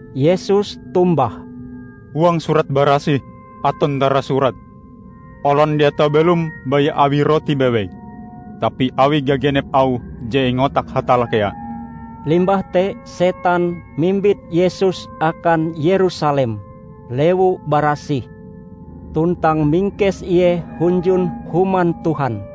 Yesus tombah, "Huang Surat Barasih aton tarasurat: Olon dia tau belom baya awi rote bewei, tapi awi gagenep auh je ingotak Hatalla kea." Limbah te setan mimbit Yesus akan Yerusalem, lewu barasih, tuntang mingkes Ie hunjun Human Tuhan.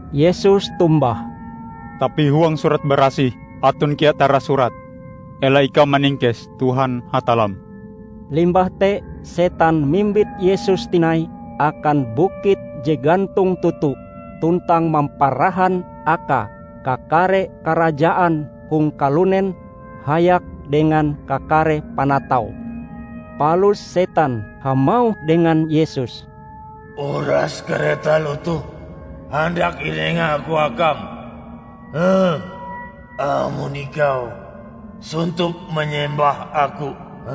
Yesus tombah, "Tapi huang Surat Barasih aton kea tarasurat, 'Ela ikau maningkes Tuhan Hatallam.' " Limbah te setan mimbit Yesus tinai akan bukit je gantong toto tuntang mamparahan Akae kakare karajaan hong kalunen hayak dengan kakare panataue. Palus setan hamauh dengan Yesus, "Uras kare taloh toh handak inengaku akam, amon ikau sontop manyembah aku."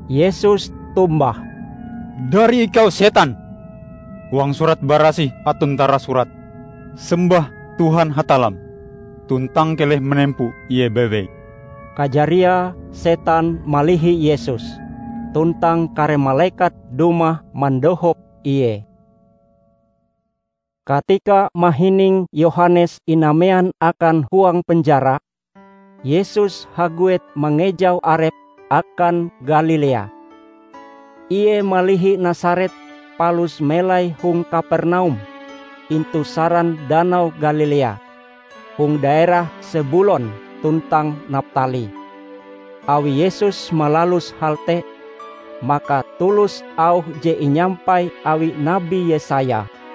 Yesus tombah, "Dari ikau setan! Huang Surat Barasih aton tarasurat: Sembah Tuhan Hatallam, tuntang keleh manempo Ie bewei!" Kajariae setan malihi Yesus, tuntang kare malekat dumah mandohop Ie. Katika mahining Yohanes inamean akan huang penjara, Yesus haguet mangejau Arepe akan Galilea. Ie malihi Nasaret palus melai hong Kapernaum, intu saran Danau Galilea hong daerah Sebulon tuntang Naptali. Awi Yesus malalus hal te, maka tulus auh je inyampai awi Nabi Yesaya: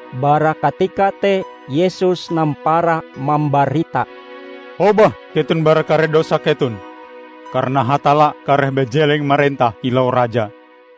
Bara katika te Yesus nampara mambarita, "Hobah keton bara kare dosan keton, karana Hatalla kareh bajeleng marentah kilau Raja!"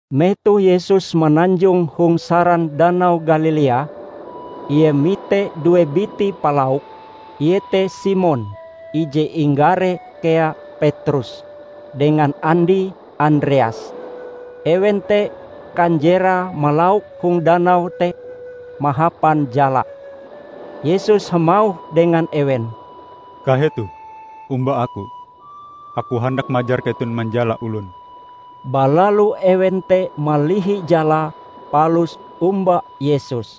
Metoh Yesus mananjong hong saran Danau Galilea, Ie mite due biti palauk, iete Simon (ije inggaree kea Petrus) dengan andie, Andreas. Ewen te kanjerae malauk hong danau te mahapan jala. Yesus hamauh dengan ewen, "Kahetoh, omba Aku. Aku handak majar keton manjala olon." Balalu ewen te malihi jalae palus omba Yesus.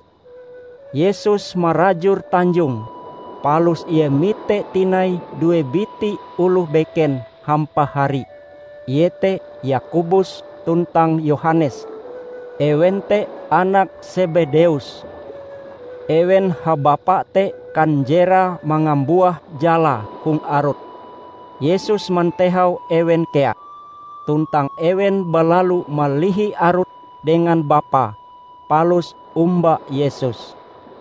Yesus marajur tanjonge, palus Ie mite tinai due biti oloh beken hampahari, iete Yakobus tuntang Yohanes, ewen te anak Sebedeus. Ewen habapa te kanjerae mangambuah jalae hong arut. Yesus mantehau ewen kea, tuntang ewen balalu malihi arute dengan bapae, palus omba Yesus.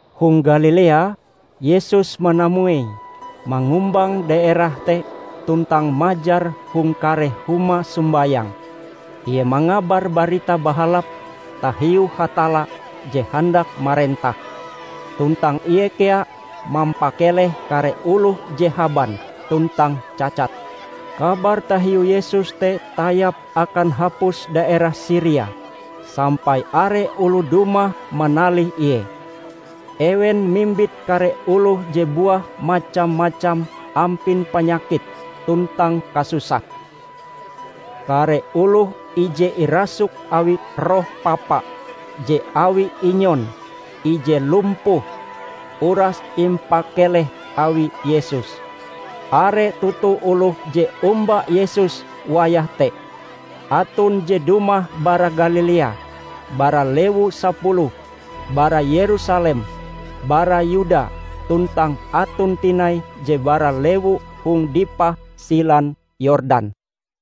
Hong Galilea, Yesus manamuei mangumbang daerah te tuntang majar hong kare huma sombayang, Ie mangabar Barita Bahalap tahiu Hatalla je handak marentah. Tuntang Ie kea mampakeleh kare oloh je haban tuntang cacat. Kabar tahiu Yesus te tayap akan hapus daerah Siria, sampai are oloh dumah manalih Ie. Ewen mimbit kare oloh je buah macam-macam ampin panyakit tuntang kasusah. Kare oloh ije irasuk awi roh papa, je awi inyon, ije lumpuh, uras impakeleh awi Yesus. Are toto oloh je omba Yesus wayah te. Aton je dumah bara Galilea, bara Lewu Sapuluh, bara Yerusalem, bara Yuda, tuntang aton tinai je bara lewu hong dipah silan Yordan.